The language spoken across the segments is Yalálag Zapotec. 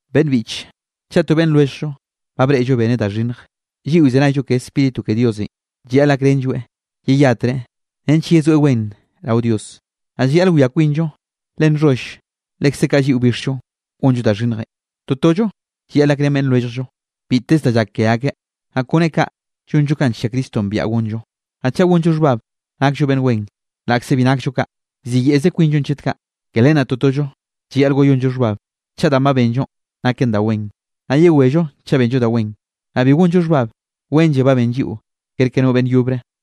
Beꞌnn biꞌche, chaꞌ to beꞌnn lwelljllonꞌ ba breꞌlloeꞌ beneꞌ da xhinnj, lliꞌo llzenayllo ke Spíritu ke Diosenꞌ, llayaꞌl gakrenlloeꞌ yeyatreꞌ nench yezoeꞌ wen rao Dios. Naꞌ llayaꞌl wia kwinllo, le nxholl lekze kaꞌ lliꞌo bixllo gonllo da xhinnjenꞌ. Totollo llayaꞌl gakrén beꞌnn lwelljllo biteze da llak ke akeꞌ, naꞌ kone kaꞌ llonllo kanꞌ nllia Cristonꞌ biaꞌa gonllo. Naꞌ chaꞌ gonllo xhbab nakllo beꞌnn wen laꞌkze bi nakllo kaꞌ, llziyeꞌze kwinllonꞌ chet kaꞌ. Ke len naꞌ totollo llayaꞌl wayonllo xhbab chaꞌ danꞌ ba benllonꞌ naken da wen. Naꞌ yewello chaꞌ benllo da wen, naꞌ bi gonllo xhbab, wenlle ba ben lliꞌo kerke no beꞌnn yobre.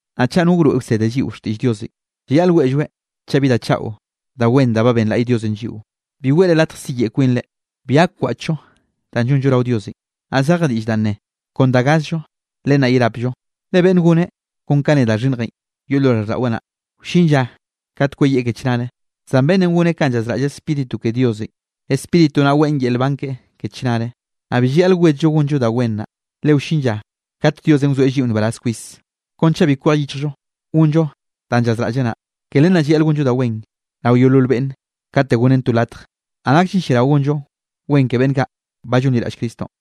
Naꞌ chaꞌ no wroeꞌ wsede lliꞌo xtiꞌll Diosenꞌ, llayaꞌl weꞌlloeꞌ chaꞌ bi da chaꞌo da wen da ba benlaꞌy Diosenꞌ lliꞌo. Bi weꞌre latj siyeꞌe kwinre, bi gak wkwaꞌchllo danꞌ llonllo rao Diosenꞌ. Naꞌ zeje diꞌll danꞌ ne: Kon da gazllo len naꞌ yerapllo. Le beꞌnn goneꞌ kon kanꞌ ne da xhinnjenꞌ yoꞌ lo raꞌlldaꞌweꞌ naꞌ, wllin lla kat kweyieꞌ ke chnare; zan beꞌnnenꞌ goneꞌ kanꞌ llazraꞌll Spíritu ke Diosenꞌ, Spíritu naꞌ weꞌn yel nban keꞌe ke chnare. Naꞌ bi llayaꞌl wedllo gonllo da wen naꞌ, le wllin lla kate Diosenꞌ wzoeꞌ lliꞌo nbaraz kwis, kon chaꞌ bi kwej yichjllo gonllo danꞌ llazraꞌlleꞌ naꞌ. Ke len naꞌ llayaꞌl gonllo da wen rao yeolol beꞌnn kate gonnen to latj, naꞌ nakllen lliarao gonllo wen ke beꞌnn kaꞌ ba llonliraꞌll Cristonꞌ.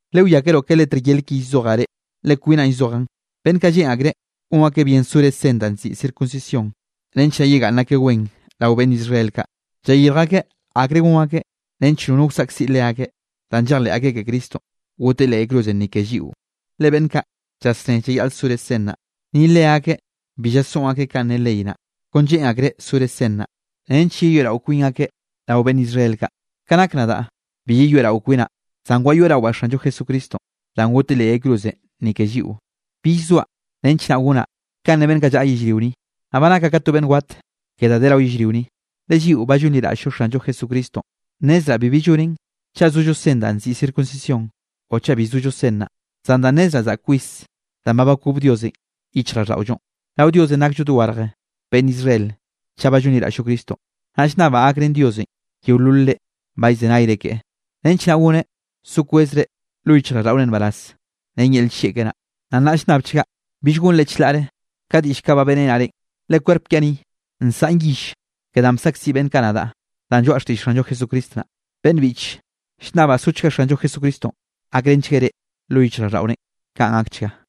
Lewiakeroꞌ ke letr yel ki llzojaꞌ reꞌ, le kwinaꞌn llzojaꞌn. Beꞌnn kaꞌ lleꞌn akreꞌ gon akeꞌ bien sore sen danꞌ nziꞌi circuncisión, nench naꞌ yegaꞌnn akeꞌ wen rao beꞌnn Israel kaꞌ. Llayirj akeꞌ akre gon akeꞌ nench nono wsaꞌkziꞌ leakeꞌ, danꞌ llejleꞌ akeꞌ ke Cristonꞌ goteꞌ leꞌ yay cruzenꞌ ni ke lliꞌo. Le beꞌnn kaꞌ llasné llayaꞌl sore sen naꞌ, ni leakeꞌ bi llasoꞌn akeꞌ kanꞌ ne ley naꞌ. Kon lleꞌn akreꞌ sore sen naꞌ, nench yeyoeꞌrao kwin akeꞌ rao beꞌnn Israel kaꞌ. Ka nak nadaꞌ, bi yeyoeꞌrao kwinaꞌ, zan wayoeꞌrawaꞌ Xanllo Jesucristonꞌ danꞌ goteꞌ leꞌ yay cruzenꞌ ni ke lliꞌo. Bill zoaꞌ nench naꞌ gonaꞌ kanꞌ ne beꞌnn kaꞌ llaꞌa yellrio ni, naꞌ ba nakaꞌ ka to beꞌnn wat ke da de rao yellrio ni. Le lliꞌo ba llonliraꞌll-llo Xanllo Jesucristonꞌ, nnezraꞌ bibi llonen chaꞌ zollo sen danꞌ nziꞌi circuncisión o chaꞌ bi zollo sen naꞌ, zan danꞌ nnezraꞌ zaꞌk kwis danꞌ ba bakob Diosenꞌ yichjraꞌlldaꞌollonꞌ. Rao Diosenꞌ nakllo dogarje beꞌnn Israel chaꞌ ba llonliraꞌll-llo Cristonꞌ. Naꞌ llnnabaꞌ gakrén Diosenꞌ yeolol reꞌ ba llzenayre keꞌe, nench naꞌ goneꞌ so kwezre lo yichjraꞌlldaꞌore nbaraz ren yel nllieꞌ keꞌe naꞌ. Naꞌ nnaꞌ llnnabchgaꞌ bill gonre chlaꞌre ka diꞌll kaꞌ ba beꞌrenaꞌ reꞌn, le kwerp kiaꞌ ni, nsaꞌn yill ke danꞌ bsaꞌkziꞌ beꞌnn kaꞌ nadaꞌ danꞌ lloaꞌa xtiꞌll Xanllo Jesucristo naꞌ. Beꞌnn biꞌche, llnnabaꞌ sochga Xanllo Jesucristonꞌ gakrenchgueꞌ reꞌ lo yichjraꞌlldaꞌorenꞌ. Kaꞌn gakchga.